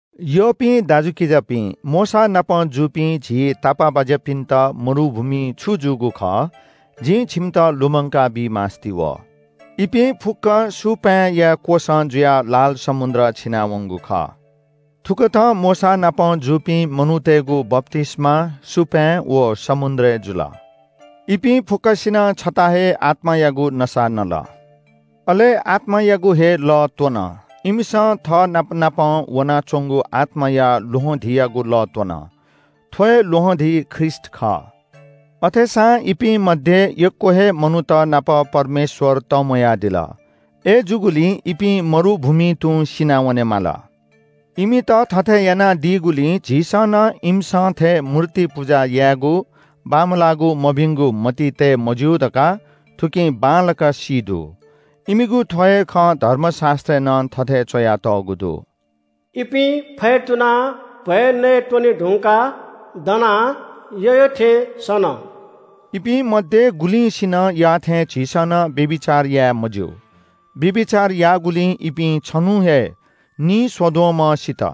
यःपिं दाजुकिजापिं, मोशानापं जूपिं झी तापाःबाज्‍यापिन्‍त मरुभूमिइ छु जूगु खः जिं छिमित लुमंकाबी मास्‍ति वः। इपिं फुक्‍कं सुपाँय्‌या क्‍वसं जुयाः लाल समुद्र छिनावंगु खः। थुकथं मोशानापं जूपिं मनूतय्‌गु बप्‍तिस्‍मा सुपाँय् व समुद्रय् जुल। इपिं फुक्‍कसिनं छता हे आत्‍मायागु नसा नल, अले आत्‍मायागु हे लः त्‍वन। इमिसं थःनापनापं वनाच्‍वंगु आत्‍माया ल्‍वहंधीयागु लः त्‍वन। थ्‍व हे ल्‍वहंधी ख्रीष्‍ट खः। अथेसां इपिं मध्‍ये यक्‍व हे मनूत नाप परमेश्‍वर तंम्‍वयादिल। अय्‌जूगुलिं इपिं मरुभूमिइ तुं सिनावनेमाल। इमित थथे यानादीगुलिं झीसं नं इमिसं थें मूर्ति पुजा यायेगु, बांमलाःगु मभिंगु मतिइ तये मज्‍यू धकाः थुकिं बांलाक सी दु। इमिगु थ्‍व हे खँ धर्मशास्‍त्रय् नं थथे च्‍वयातःगु दु – “इपिं फ्‍यतुनाः भ्‍वय् नयेत्‍वने धुंकाः दनाः यःयःथें सन।” इपिं मध्‍ये गुलिंसिनं याःथें झीसं नं व्‍यभिचार याये मज्‍यू। व्‍यभिचार याःगुलिं इपिं छन्‍हुं हे नीस्‍वद्वःम्‍ह सित।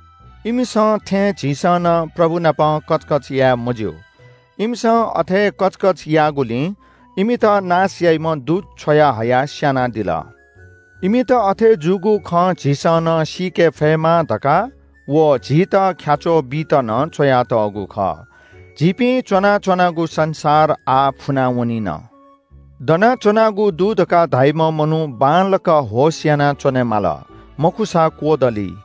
इमिसं थें झीसं नं प्रभु नाप कचकच याये मज्‍यू। इमिसं अथे कचकच याःगुलिं इमित नाश याइम्‍ह दूत छ्वयाहयाः स्‍यानादिल। इमित अथे जूगु खँ झीसं नं सीके फयेमा धकाः व झीत ख्‍याच्‍वः बीत नं च्‍वयातःगु खः। झीपिं च्‍वनाच्‍वनागु संसार आः फुना वनिन। दनाच्‍वनागु दु धकाः धाइम्‍ह मनू बांलाक होश याना च्‍वनेमाली, मखुसा क्‍वदली।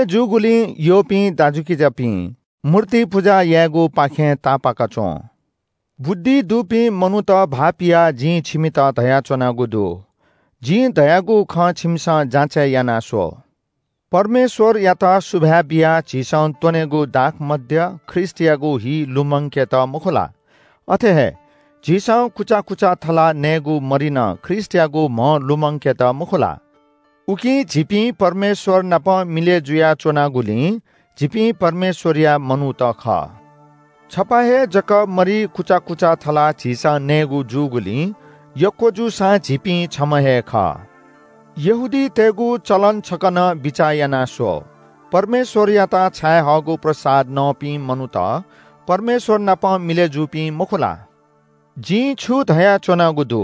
अथे जूगुलिं यःपिं दाजुकिजापिं, मूर्ति पुजा यायेगुपाखें तापाक च्‍वँ। बुद्धि दुपिं मनूत भाःपियाः जिं छिमित धयाच्‍वनागु दु। जिं धयागु खँ छिमिसं जाँचय् याना स्‍व। परमेश्‍वरयात सुभाय् बियाः झीसं त्‍वनेगु दाखमद्य ख्रीष्‍टयागु हि लुमंकेत मखु ला? अथे हे झीसं कुचा कुचा थलाः नयेगु मरि नं ख्रीष्‍टयागु म्‍ह लुमंकेत मखु ला? उकिं झीपिं परमेश्‍वर नाप मिलय् जुयाच्‍वनागुलिं झीपिं परमेश्‍वरया मनूत खः। छपा हे जक मरि कुचा कुचा थलाः झीसं नयेगु जूगुलिं यक्‍व जूसां झीपिं छम्‍ह हे खः। यहूदीतय्‌गु चलन छकः नं बिचाः याना स्‍व। परमेश्‍वरयात बलि छायेहःगु प्रसाद नःपिं मनूत परमेश्‍वर नाप मिलय् जूपिं मखु ला? जिं छु धयाच्‍वनागु दु?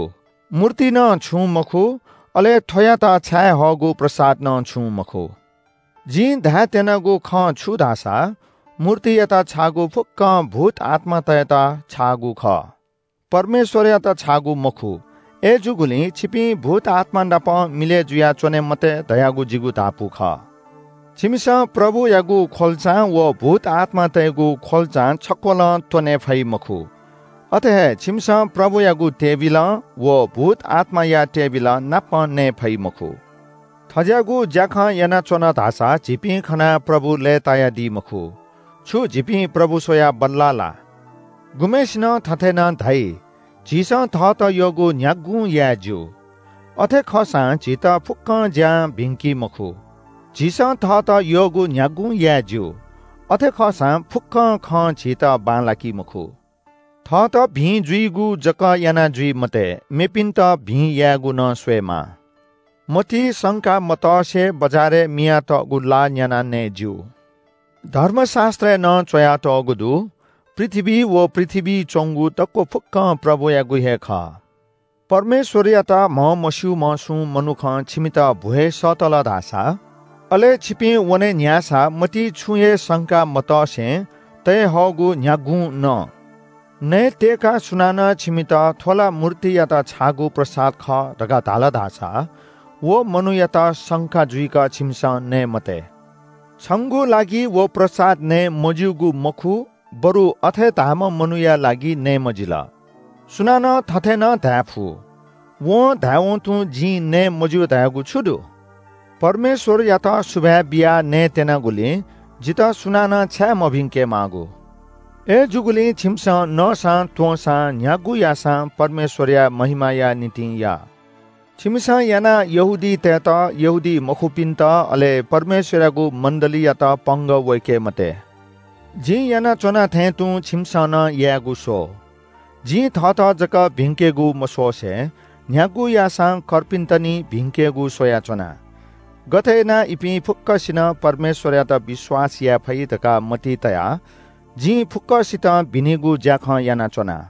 मूर्ति नं छुं मखु, अले थ्‍वयात छायेहःगु प्रसाद नं छुं मखु। जिं धायेत्‍यनागु खँ छु धाःसा मूर्तियात छाःगु फुक्‍कं भूतआत्‍मातय्‌त छाःगु खः, परमेश्‍वरयात छाःगु मखु। अय्‌जूगुलिं छिपिं भूतआत्‍मा नाप मिलय् जुयाच्‍वने मते धयागु जिगु धापू खः। छिमिसं प्रभुयागु ख्‍वल्‍चां व भूतआत्‍मातय्‌गु ख्‍वल्‍चां छक्‍वलं त्‍वनेफइ मखु। अथे हे छिमिसं प्रभुयागु टेबिलं व भूतआत्‍माया टेबिलंनापं नये फइ मखु। थज्‍याःगु ज्‍याखँ यानाच्‍वन धाःसा झीपिं खनाः प्रभु लय्‌तायादी मखु। छु झीपिं प्रभु स्‍वयाः बल्‍ला ला? गुम्‍हय्‌सिनं थथे नं धाइ – “झीसं थःत यःगु न्‍ह्यागुं याये ज्‍यू।” अथे खःसां झीत फुक्‍क ज्‍यां भिंकी मखु। “झीसं थःत यःगु न्‍ह्यागुं याये ज्‍यू।” अथे खःसां फुक्‍क खं झीत बांलाकी मखु। थःत भिं जुइगु जक याना जुइ मते। मेपिंन्‍त भिं यायेगु नं स्‍वयेमाः। मतिइ संका मतसे बजारय् मियातःगु ला न्‍यानाः नये ज्‍यू। धर्मशास्‍त्रय् नं च्‍वयातःगु दु – “पृथ्‍वी व पृथ्‍वीइ च्‍वंगु दक्‍व फुक्‍कं प्रभुयागु हे खः।” परमेश्‍वरयात म्‍हमस्‍यूम्‍ह सुं मनुखं छिमित भ्‍वय् सःतल धाःसा, अले छिपिं वने न्‍ह्याःसा मतिइ छुं हे संका मतसे तये हःगु न्‍ह्यागुं न। नयेत्‍यय्‌काः सुनानं छिमित – “थ्‍व ला मूर्तियात छाःगु प्रसाद खः” धकाः धाल धाःसा व मनूयात संका जुइक छिमिसं नये मते। छंगु लागि व प्रसाद नये मज्‍यूगु मखु बरु अथे धाःम्‍ह मनूया लागि नये मजिल। सुनानं थथे नं धायेफु – “वं धायेवं तुं जिं नये मज्‍यू धयागु छु दु? परमेश्‍वरयात सुभाय् बियाः नये त्‍यनागुली जितः सुनानं छाय् मभिंके माःगु?” अय्‌जूगुलिं छिमिसं नःसां त्‍वंसां न्‍ह्यागु याःसां परमेश्‍वरया महिमाया निंतिं या। छिमिसं यानाः यहूदीतय्‌त, यहूदीमखुपिन्‍त अले परमेश्‍वरयागु मण्‍डलीयात पंगः वय्‌के मते। जिं यानाच्‍वना थें तुं छिमिसं नं यायेगु स्‍व। जिं थःत जक भिंकेगु मस्‍वसे न्‍ह्यागु याःसां कर्पिन्‍त निं भिंकेगु स्‍वयाच्‍वना। गथे यानाः इपिं फुक्‍कसिनं परमेश्‍वरयात विश्‍वास याये फइ धकाः मतिइ तयाः जिं फुक्‍कसितं भिनिगु ज्‍याखँ यानाच्‍वना।